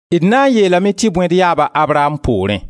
D na n yeelame tɩ bõe d yaaba Abraam poorẽ?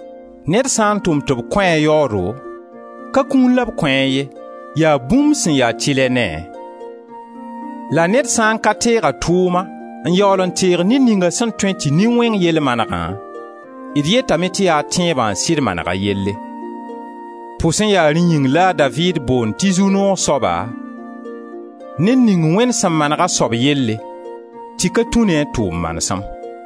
Ned sã n tʋm tɩ b kõ a yaoodo, ka kũun la b kõ a ye, yaa bũmb sẽn ya tɩlɛ ne-a. La ned sã n ka teeg a tʋʋma n yaool n teeg ned ninga sẽn tõe tɩ nin-wẽng yell manegã, d yetame tɩ yaa tẽebã n sɩd maneg a yelle. Pʋsẽ yaa rẽ yĩng la a Daviid boond tɩ zu-noog soaba ned ning Wẽnd sẽn maneg a soab yelle tɩ ka tũ ne a tʋʋm manesem: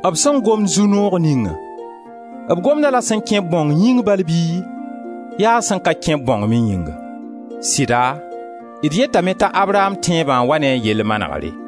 B sẽn gomd zu-noog ningã, b gomd-a-la sẽn kẽ-b bãong yĩng bala bɩ yaa sẽn ka kẽ-b bãong me yĩnga? Sɩda d yetame t'a Abraam tẽebã n wa ne a yell manegre.